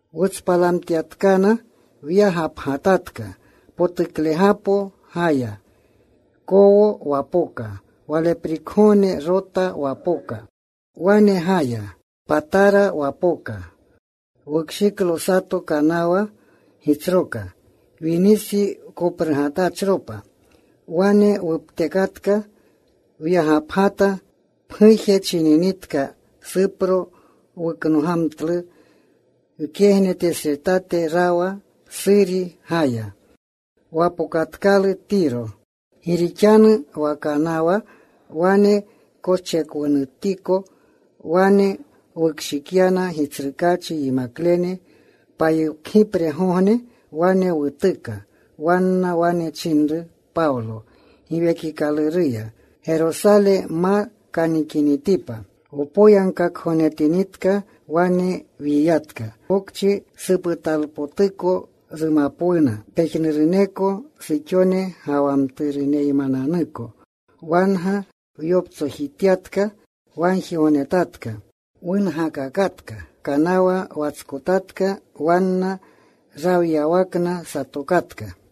Wutspalamtyatkana, wyagapgatatka. Potuklegapo gaya. Kowo wapoka. Waleprikgogne Rota wapoka. Wane gaya. Patara wapoka. Wukshiklo sato kanawa gitsroka. Winisi koprugatachropa. Wane wuptekatka. Wyagapgata. Pguje chininitka Supro. Wuknogamtlu. Wkegnetesretate rawa. Suri gaya. Wapokatkalu Tiro. Gi rixanu wa kanawa wane koschekwunutiko. Wane wukshikyana Gitsrukaachi yimaklene. Payokgipregogne wane wutuka. Wanna wane chinru Pawlo Giwekikaluruya Gerosale ma kanikinitipa. Wpoyagkakgognetinitka, wyiyatka. Pokchi suputalpotuko rumapwuna pejnuruneko suxone ga wa mturuneymananuko. Wanga wyoptsojitatka. Wagjigognetatka. Wungakakatka. Kanawa watskotatka. Wanna rawyawakna satokatka.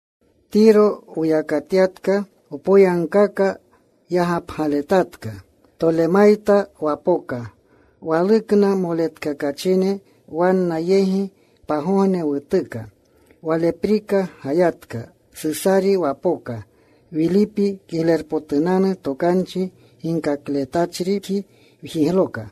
Tiro wuyakatyatka. Wpoyagkaka yagapgaletatka. Tolemayta wapoka. Walukna moletkakachine. Wanna yegi pagogne wutuka. Waleprika gayatka. Susari wapoka. Wilipi Kiglerpotunanu Tokanchi ginkakletachripji wjigloka.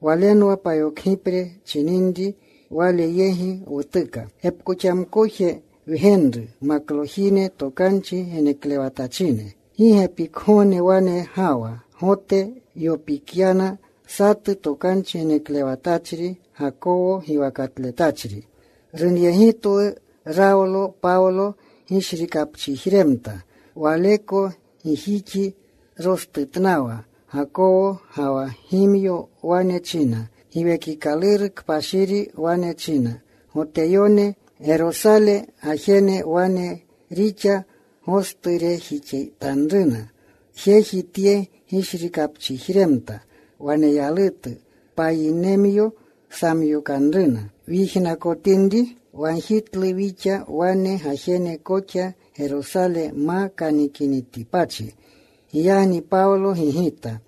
Walenwa payokgipre chininri. Wale yegi wutuka. Gepkoxamkoje wgenru. Maklojine. Tokanchi geneklewatachine. Gi gepikgogne wane gawa. Gote yopikyana satu tokanchi geneklewatachri Gakawo giwakatletachri. Runyegitwu. Rawlo Pawlo gishrikapchijremta rawa. Waleko gijixi rostutnawa Gakawo, ga wa gimyo. Wane china, “Giwekikaluru Kpashiri wane china, ‘Goteyone Gerosale gajene wane rixa gosturejixanruna jeji tye gishrikapchijremta waneyalutu. Payinemyo samyokanruna.’” Wyijnakotinri, wagjitlu wixa wane gajene koxa Gerosale ma kanikinitipachi. Giyagni Pawlo gigita,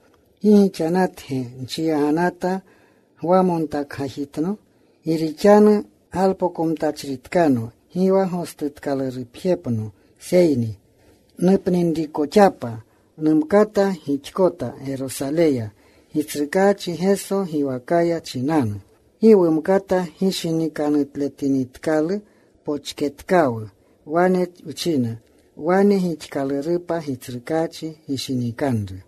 “¿Gi gixanatge nchiyaganata, gwamontakgajitno? Gi rixanu galpokomtachritkano gi wa gostutkalurupjepno, seyni nupninrikoxapa numkata gixkota Gerosaleya Gitsrukaachi Geso giwakaya chinanu.” Gi wumkata gishinikanutletinitkalu, pochketkawu. Wane wchina, “Wane gixkalurupa Gitsrukaachi gishinikanru.”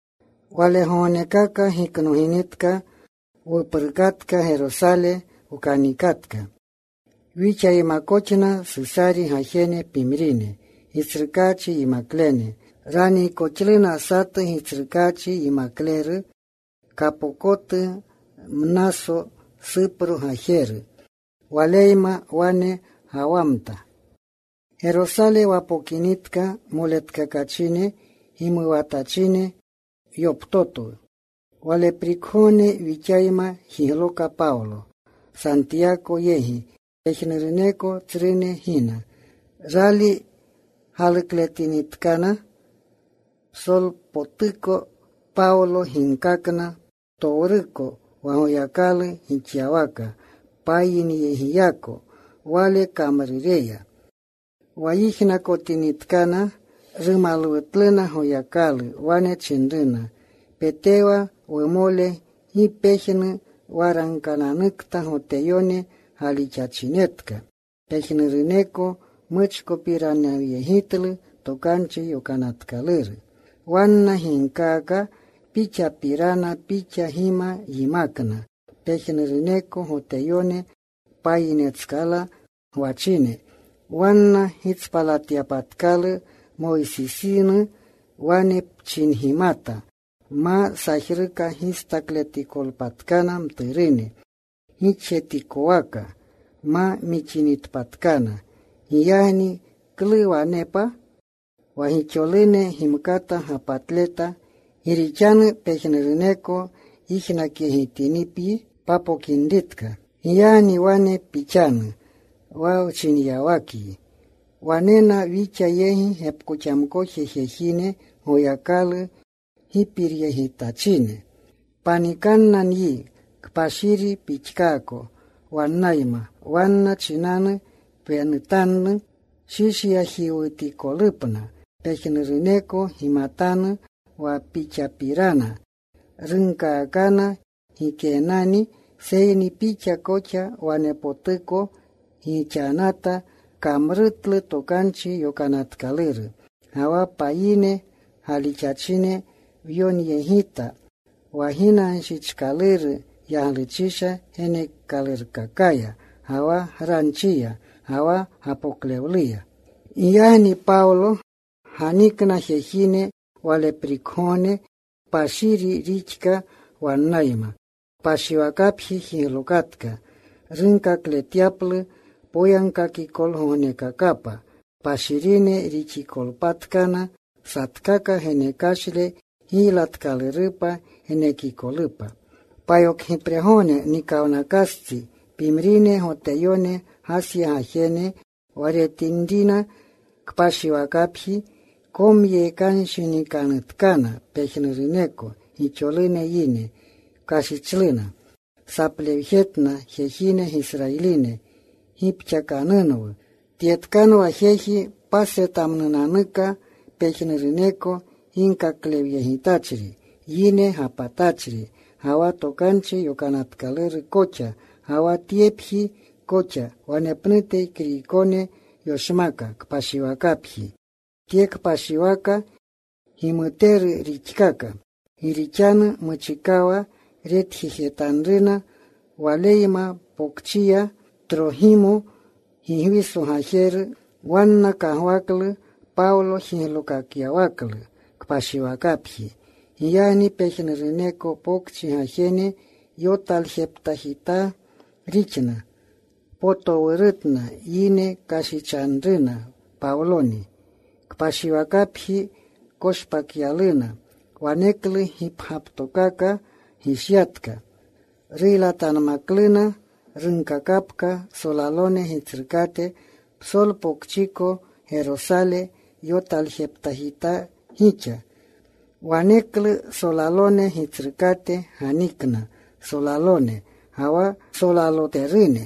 Walegognekaka giknoginitka, wuprukatka. Gerosale wkanikatka. Wixaymakoxna Susari gajene pimrine Gitsrukaachi yimaklene. Raniikoxluna satu Gitsrukaachi yimakleru kapokotu, Mnaso, Supro gajeru. Waleyma wane gawamta. Gerosale wapokinitka moletkakachine gimuwatachine yoptotwu. Waleprikgogne wixayma jigloka Pawlo Santiyako yegi. Pejnuruneko tsrune gina. Rali galukletinitkana, psolpotuko Pawlo ginkakna ptowruko wa Goyakalu gixyawaka payineyegiyako wale kamrureya. Wa yijnakotinitkana, rumalwutluna Goyakalu. Wane chinruna, “Petewa, wumole, gi pejnu waragkananukta Goteyone galixachinetka. Pejnuruneko muchkopiranawyegitlu Tokanchi Yokanatkaluru. Wanna ginkaaka pixapirana: pixa gima yimakna pejnuruneko Goteyone payinetskala gwachine wanna gitspalatyapatkalu Moysisinu. Wane pchingimata ma sajruka gistakletikotpatkana mturune; gixjetikwaka ma mixinitpatkana. Giyagni ¿klu wanepa? Wa gixolune gimkata gapatleta. Gi rixanu pejnuruneko yijnakyegitinipyi papokinritka. Giyagni wane pixanu wa wchinyawakyi. Wanena wixa yegi gepkoxamkoje jejine Goyakalu gipiryegitachine. Panikanna nyi. Kpashiri pixkaako wannayma. Wanna chinanu pwenutanu shishyajiwutikolupna. Pejnuruneko gimatanu wa pixapirana runkaakana gikeenani, seyni pixa koxa wanepotuko gixanata. Pkamrutlu Tokanchi Yokanatkaluru. Ga wa payine galixachine wyonyegita wa ginanshichkaluru yagluchisha geneekalurkakaya, ga wa granchiya, ga wa gapoklewluya.” Giyagni Pawlo ganikna jejine. Waleprikgogne kpashiri rixka wannayma. Kpashiwakapji jiglokatka. Runkakletyaplu poyagkakikolgognekakapa kpashirine rixikolpatkana, satkaka genekashle giylatkalurupa genekikolupa. Payokgipregogne nikawnakastsi, pimrine Goteyone Gasya gajene, wa retinrina kpashiwakapji, komyekanshinikanutkana pejnuruneko gixolune yine. Kashichluna. Saplewjetna, “Jejine, Gisrayiline, gipxakanunwu. Tyetkanwa jeji pasretmnunanuka pejnuruneko ginkaklewyegitachri, yine gapatachri, ga wa Tokanchi Yokanatkaluru koxa, ga wa tyepji koxa. Wanepnute Kriykone yoshmaka kpashiwakapji. Tye kpashiwaka gimuteru rixkaka.” Gi rixanu muchikawa retjejetanruna waleyma pokchiya Trogimo, Gigwiso gajeru. Wanna kagwaklu Pawlo jiglookakyawaklu kpashiwakapji. Giyagni pejnuruneko pokchi gajene yotaljeptaajitaa rixna. Potowurutna yine. Kashichanruna Pawloni. Kpashiwakapji koshpakyaluna. Waneklu gipgyaptokaka gishyatka. Ruylatanmakluna. Runkakapka solalone gitsrukate, “Psolpokchiko Gerosale yotaljeptaajitaa gixa.” Waneklu solalone gitsrukate ganikna solalone ga wa ksolaloterune.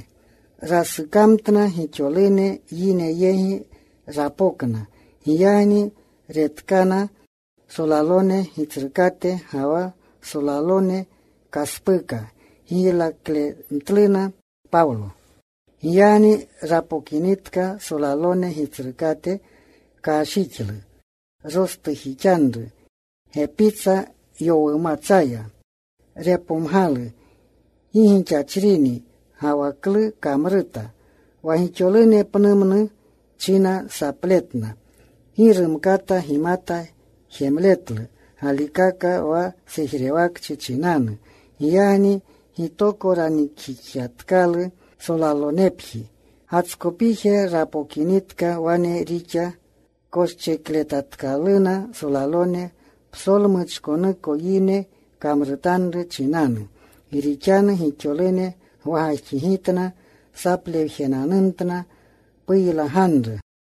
Rasukamtna. Gixolune yine yegi rapokna. Giyagni retkana, solalone gitsrukate ga wa solalone, kaspuka giylaklemtluna Pawlo. Giyagni rapokinitka solalone gitsrukate, kashjixlu. Rostujixanru gepitsa yowumatsaya. Repomgalu gi gixachrini, ga wa klu kamruta. Wa gixolune pnumnu china sapletna. Gi rumkata gimata jemletlu galikaka wa sejrewakchi chinanu. Giyagni gitoko ranikjixatkalu solalonepji. Gatskopije rapokinitka. Wane rixa koschekletatkaluna solalone psolmuchkonuko yine kamrutanru chinanu. Gi rixanu gixolune gwagajxigitna. Saplewananumtna, “¡Puylaganru!”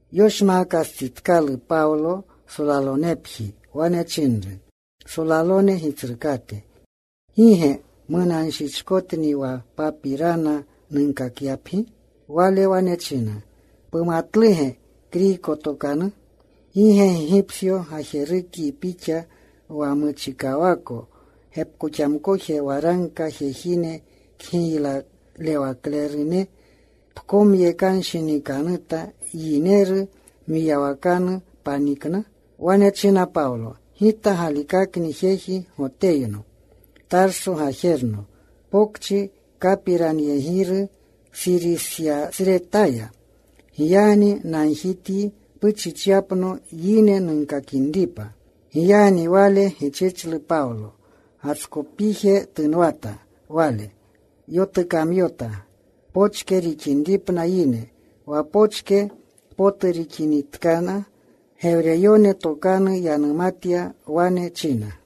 Yoshmaakastsitkalu Pawlo solalonepji, wane chinru solalone gitsrukate, “¿Gi ge munanshichkotni wa papirana nunkakyapyi?” Wale wane china, “¿Pumatluge Kriyko tokanu? ¿Gi ge Gigipsyo gajerukyi pixa, wa muchikawako gepkoxamkoje waragka jejine kgiylalewaklerune pkomyekanshinikanuta; yineru mwiyawakanu panikna?” Wane china Pawlo, “Gita galikakni jeji Goteyno, Tarso gajerno, pokchi kapiranyegiru Surisyasretaya. Giyagni nagjityi puchichyapno yine nunkakinripa.” Giyagni wale gichichlu Pawlo. Gatskopije tunwata wale. Yotukamyota pochke rixinripna yine. Wa pochke potu rixinitkana, Gewreyone tokanu yanumatya. Wane china,